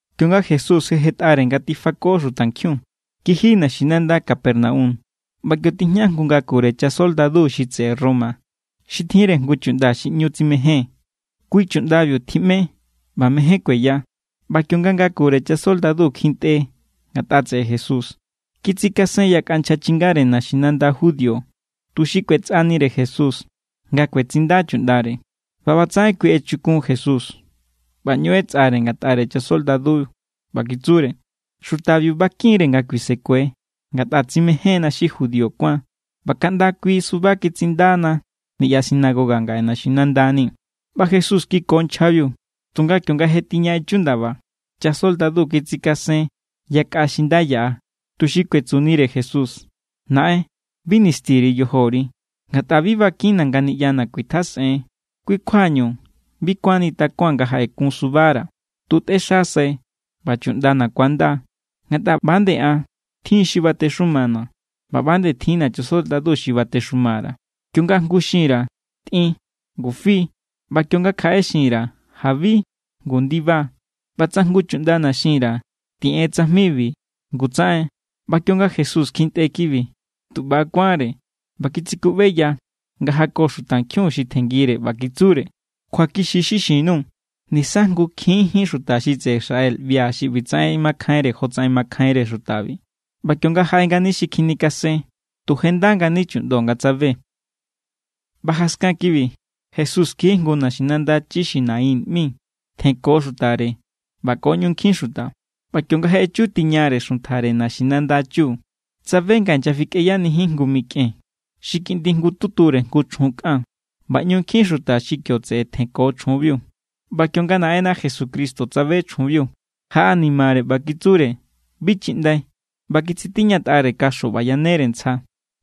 Kionga Jesús jetꞌare nga tifako xutankjiun, kiji naxinanda Capernaum. ꞌBa kio tijña jngu ngakure chasoldadu xi tseꞌe Roma xi tjinre jngu chuꞌnda xi ꞌñu tsimején. Kui chuꞌndabiu tjiꞌme ꞌba mejen kueya. ꞌBa kionga ngakure chasoldadu kjintꞌe ngatꞌa tseꞌe Jesús, kitsikasen yakꞌa nchja chingare naxinanda judío, tuxi kꞌuetsꞌanire Jesús nga kuetsinda chuꞌndare. ꞌBa ꞌbatsaꞌen kui echukun Jesús ꞌba ꞌñu ꞌetsꞌare ngatꞌare chasoldadu, ꞌba kitsure: —Xutabiu bakin=re nga kuisekue. Ngatꞌa tsimejénna xi judío kuáan ꞌba kaꞌnda kui suba kitsindana niꞌya sinagoga ngaꞌe naxinandani̱. ꞌBa Jesús kiko nchjabiu. Tunga kionga je tiña echu ndaba, chasoldadu kitsikasen yakꞌa xi nda yaꞌa, tuxi kuetsunire Jesús: —Naꞌen, bi nisti_ri yojori, ngatꞌa bi bakinna̱ nga niꞌyana̱ kuitjasꞌen. Kui kjuañu bi kuánni takuaa̱n nga jaꞌekun subara̱. Tu tꞌexasai ꞌba chuꞌndana̱ ku̱anda. Ngatꞌa ꞌba=nde an, tjin= xi batexumana̱ ꞌba ꞌba=nde tjinna̱ chasoldadu xi batexuma_ra̱. Kionga jngu xin_ra̱: “Tꞌin”, ngu fi. ꞌBa kionga kjaꞌere xin_ra̱: “Jabi”, ngu ndiba. ꞌBa tsa jngu chuꞌndana̱ xin_ra̱: “Tiꞌen tsajmibi”, ngu tsaꞌen. ꞌBa kionga Jesús kjintꞌe kibi, tu ꞌba= kuánre ꞌba kitsikuꞌbeya nga jako xutankjiun xi tjenngire, ꞌba kitsure: —Kjuakixi= xi xin_nuu̱. Nisa jngukjinjín xuta xi tseꞌe Israel ꞌbia̱ xi ꞌbitsaꞌen makjainre jotsaꞌen makjainre xutabi. ꞌBa kionga jaꞌe ngani xi kjinikasen, tu je nda ngani chuꞌndo nga tsabe. ꞌBa jaskan kibi, Jesús kiji jngu naxinanda chi xi Naín ꞌmi. Tjenko xutare ꞌba ko ꞌñu nkjin xuta. ꞌBa kionga je echu tiñare xuntjare naxinanda chu, tsabe nga inyafikꞌeyanijin jngu mikꞌen xi kiꞌndi jngututure jngu chjun kꞌan. ꞌBa ꞌñu nkjin xuta xi kio tseꞌe tjenko chjunbiu. ꞌBa kionga Naꞌenna Jesucristo tsabe chjunbiu, jaꞌanimare ꞌba kitsure: —Bi chiꞌndai. ꞌBa kitsitiñatꞌare kaxo ꞌba yanere ntsja.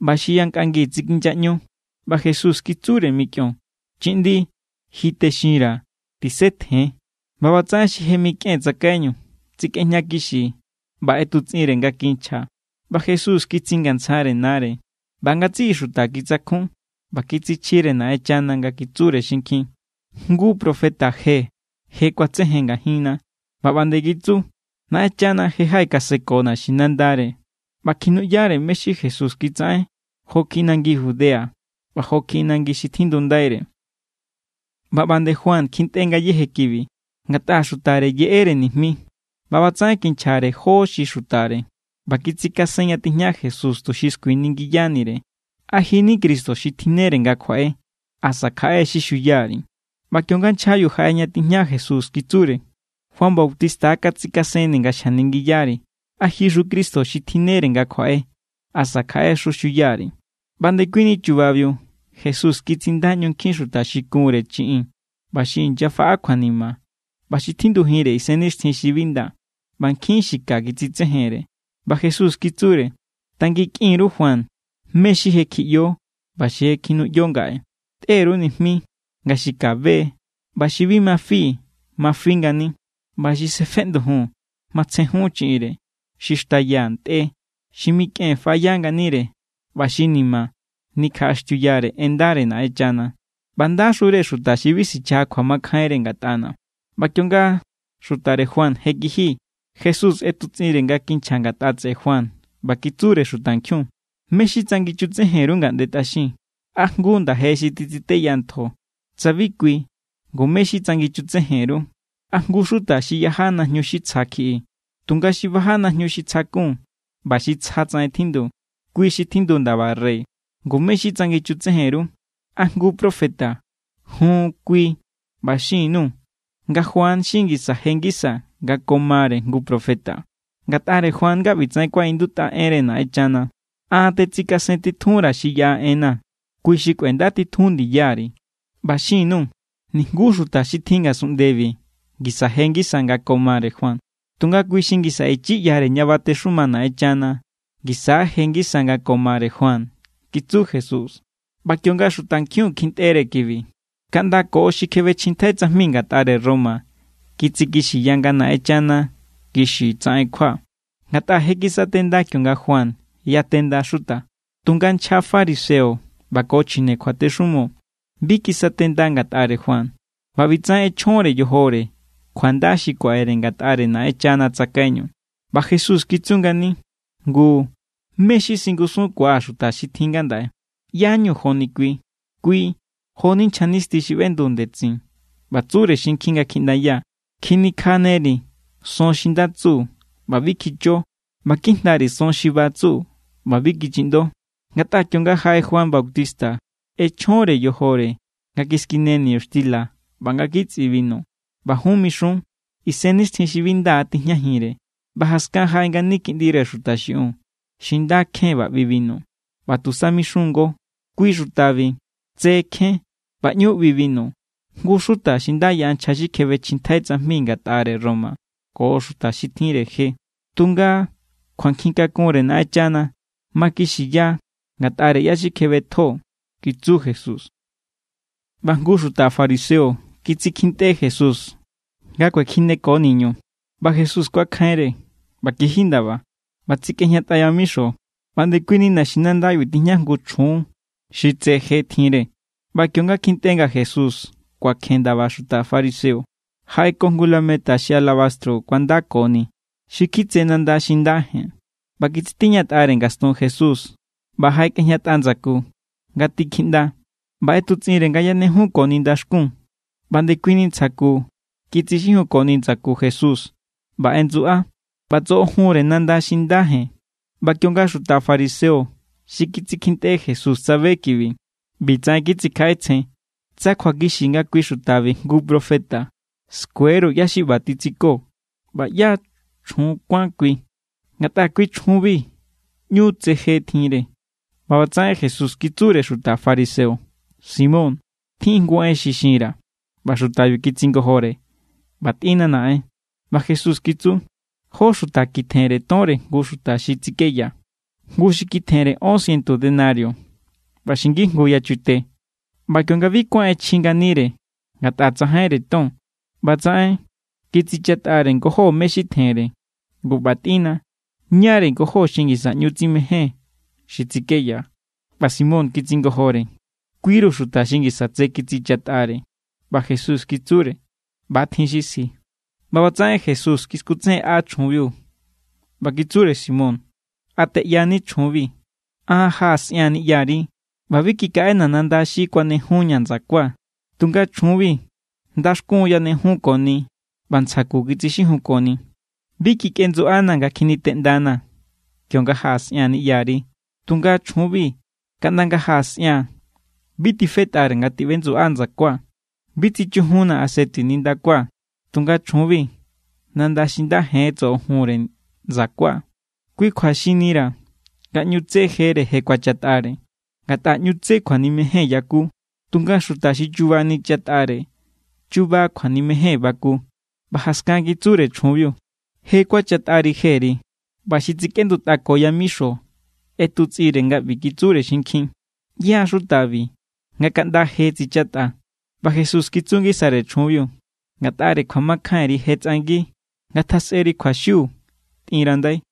ꞌBa xi yankꞌangi tsikinyaꞌñu. ꞌBa Jesús kitsure mikꞌion: —Chiꞌndi, ji texinra̱. ¡Tisetjen! ꞌBa ꞌbatsaꞌen xi je mikꞌen tsakaiñu tsikꞌejña kixi ꞌba ꞌetutsꞌinre nga kinchja, ꞌba Jesús kitsingantsjare nare. ꞌBa ngatsiꞌi xuta kitsakjun ꞌba kitsichjire Naꞌenchana nga kitsure xinkjin: —Jngu profeta je je kuatsejen ngajinna. ꞌBa ꞌba nde kitsu: —Naꞌenchana je jaꞌekaseko naxinandare. ꞌBa kjinuꞌyare mé= xi Jesús kitsaꞌen jo kjiꞌi nangi Judea ꞌba jo kjiꞌi nangi xi tjindundaire. ꞌBa ꞌba nde Juan kjintꞌe ngayéje kibi, ngatꞌa xutare yeꞌere nijmi. ꞌBa ꞌbatsaꞌen kinchjare jó xi xutare ꞌba kitsikasen ña tijña Jesús, tuxi skuiningiyanire: “¿A ji= ni Cristo xi tjinnere nga kjuaꞌe? ¿Asa kjaꞌe xi xuya_ri̱?” ꞌBa kionga nchjabiu jaꞌe ña tijña Jesús, kitsure: —Juan Bautista katsikasenni̱ nga xjaningiyari̱: “¿A jixu Cristo xi tjinnere nga kjuaꞌe? ¿Asa kjaꞌexu xuya_ri̱?” ꞌBa ndekuini chubabiu Jesús kitsinda ꞌñu nkjin xuta xi kunre chiꞌin ꞌba xi inyafaꞌa kjuanima ꞌba xi tjindujinre isennixtjin xi bi nda, ꞌba nkjin xi ka kitsitsejenre. ꞌBa Jesús kitsure: —Tanginkꞌin_ru Juan mé= xi je kjiꞌyo ꞌba xi je kjinuꞌyo ngaꞌe. Tꞌe_ru nijmi nga xi ka be=, ꞌba xi bi ma fi ma fi ngani, ꞌba xi sefeꞌndujun matsjejun chiꞌinre. Xi xtaya ntꞌe, xi mikꞌen faꞌaya nganire, ꞌba xi ni̱ma̱ nikjaꞌaxtiuyare en ndare Naꞌenchana. ¡ꞌBa ndaxure xuta xi bi sichaja kjuamakjainre ngatꞌana̱! ꞌBa kionga xutare Juan je kiji, Jesús ꞌetutsꞌinre nga kinchja ngatꞌa tseꞌe Juan ꞌba kitsure xutankjiun: —¿Mé= xi tsanginchutsejen_ru ngaꞌnde tꞌaxin? ¿A jngu nda̱je xi titsiteya ntjo? Tsa bi kui, ngu, ¿mé= xi tsanginchutsejen_ru? ¿A jngu xuta xi yaja najñu xi tsja kjiꞌi? Tunga xi baja najñu xi tsja kun ꞌba xi tsja tsaꞌen tjindu, kui xi tjindu ndaba rey. Ngu, ¿mé= xi tsanginchutsejen_ru? ¿A jngu profeta? Jun, kui. ꞌBa xin_nuu̱ nga Juan xi ngisa je ngisa nga ko mare jngu profeta. Ngatꞌare Juan= nga ꞌbitsaꞌen kuaꞌindutꞌa enre Naꞌenchana: An tetsikasentitjunra̱ xi yaꞌa enna̱. Kui xi kꞌuendatitjun ndiyari. ꞌBa xin_nuu̱. Nijngu xuta xi tjin ngasunꞌndebi ngisa je ngisa nga ko mare Juan. Tunga kui xi ngisa ichi ꞌyare ña batexuma Naꞌenchana ngisa= je ngisa nga ko mare Juan —kitsu Jesús. ꞌBa kionga xutankjiun kjintꞌere kibi, kaꞌnda ko xi kjebechjintjai tsajmi ngatꞌare Roma kitsikixiya nga Naꞌenchana kixi tsaꞌen kjua. Ngatꞌa je kisatenda kionga Juan yatenda xuta. Tunga nchja fariseo ꞌba ko chjine kjuatexumo bi kisatenda ngatꞌare Juan, ꞌba ꞌbitsaꞌen ꞌechjonre yojore kjuanda xi kuaꞌere ngatꞌare Naꞌenchana tsakaiñu. ꞌBa Jesús kitsu ngani: —Ngu, ¿mé= xi singusunkuaa̱ xuta xi tjin ngandaꞌe? ¿ꞌYá=ñu̱ joni kui? Kui jo=ni nchja nisti xi ꞌbendu ndetsin ꞌba tsure xinkjin nga kjiꞌndaya: “Kjinikjaneri̱ son xi nda tsu, ꞌba bi kjicho. ꞌBa kijndari̱ son xi ba tsu, ꞌba bi kichiꞌndo.” Ngatꞌa kionga jaꞌe Juan Bautista, ꞌechjonre yojore nga kiskine niñuxtila ꞌba nga kitsꞌi binu, ꞌba jun mixun: “Isennixtjin xi bi nda tijñajinre.” ꞌBa jaskan jaꞌe ngani Kiꞌndire Xuta xiꞌiun, xi nda kjen ꞌba ꞌbi binu, ꞌba tusa mixun=ngo: “Kui xutabi tse kjen ꞌba ꞌñu ꞌbi binu, jngu xuta xi nda yaꞌa nchja xi kjebechjintjai tsajmi ngatꞌare Roma ko xuta xi tjinre je.” Tunga kjuankjin kakunre Naꞌenchana makixiya ngatꞌare ꞌyá= xi kjebetjo —kitsu Jesús. ꞌBa jngu xuta fariseo kitsikjintꞌe Jesús nga kuekjineko niñu, ꞌba Jesús kuakjainre ꞌba kiji ndaba ꞌba tsikꞌejñatꞌa yamixo. ꞌBa ndekuini naxinandabiu tijña jngu chjun xi tse je tjinre. ꞌBa kionga kjintꞌe nga Jesús kuakjen ndaba xuta fariseo, jaꞌeko jngu lameta xi alabastro kuandakoni xi kjitse nanda xi nda jen. ꞌBa kitsitiñatꞌare ngastun Jesús ꞌba jaꞌekꞌejñatꞌa ndsaku, nga tikjiꞌnda. ꞌBa ꞌetutsꞌinre nga yanejunkoni ndaxkun. ꞌBa ndekuini ntsja ku kitsixijunkoni ndsaku Jesús, ꞌba ꞌendsuꞌa, ꞌba tsoꞌojunre nanda xi nda jen. ꞌBa kionga xuta fariseo xi kitsikjintꞌe Jesús tsabe kibi, ꞌbitsaꞌen kitsikjaꞌetsjen: “Tsa kjuakixi nga kui xutabi jngu profeta, skue=ru ꞌyá= xi ꞌba titsiko ꞌba ꞌyá= chjun kuán kui, ngatꞌa kui chjunbi ꞌñu tsé je tjinre.” ꞌBa ꞌbatsaꞌen Jesús kitsure xuta fariseo: —Simón, tjin= jngu en xi xinra̱. ꞌBa xutabiu kitsingojore: —ꞌBa tꞌínna, naꞌen. ꞌBa Jesús kitsu: —Jó xuta kitjenre tonre jngu xuta xi tsikeya. Jngu xi kitjenre ón ciento denario, ꞌba xi ngijngu yachute. ꞌBa kionga bi kuán ꞌechji nganire ngatꞌa tsajainre ton, ꞌbatsaꞌen kitsichatꞌare ngojó mé= xi tjenre. Ngu ꞌba tꞌínna, ¿ñáre̱ ngojóbi xi ngisa ꞌñu tsimején xi tsikeya? ꞌBa Simón kitsingojore: —Kui=ru xuta xi ngisa tse kitsichatꞌare. ꞌBa Jesús kitsure: —ꞌBa=tjin xi sji. ꞌBa ꞌbatsaꞌen Jesús kiskutsejenꞌa chjunbiu, ꞌba kitsure Simón: —¿A teꞌyani chjunbi? An jaꞌasꞌia̱n niꞌyari ꞌba bi kikaꞌena̱ nanda xi kuanejunña̱ ndsakua̱. Tunga chjunbi, ndaxkun yanejunkoni ꞌba ntsja ku kitsixijunkoni. Bi kikꞌendsuꞌanaa̱ nga kjiniteꞌndanaa̱ kionga jaꞌasꞌia̱n niꞌyari, tunga chjunbi kaꞌnda nga jaꞌasꞌia̱n bi tifetꞌare nga tiꞌbendsuꞌá ndsakua̱. Bi tsichujunnaa̱ aseti nindakua̱, tunga chjunbi nanda xi nda jen tsoꞌojunre ndsakua̱. Kui kjua xinnira̱ nga ꞌñu tsé jere je kuachatꞌare, ngatꞌa ꞌñu tsé kjuanimejen yaku. Tunga xuta xi chuba nichatꞌare, chuba kjuanimejen baku. ꞌBa jaskan kitsure chjunbiu: —Je kuachatꞌari jeri. ꞌBa xi tsikꞌendutꞌako yamixo ꞌetutsꞌinre nga ꞌbi kitsure xinkjin: —¿Yá= xutabi, nga kaꞌnda je tsichatꞌa? ꞌBa Jesús kitsu ngisare chjunbiu: —Ngatꞌare kjuamakjainri je tsꞌangi. Ngatjasꞌeri kjuaxiu. Tꞌinrandai.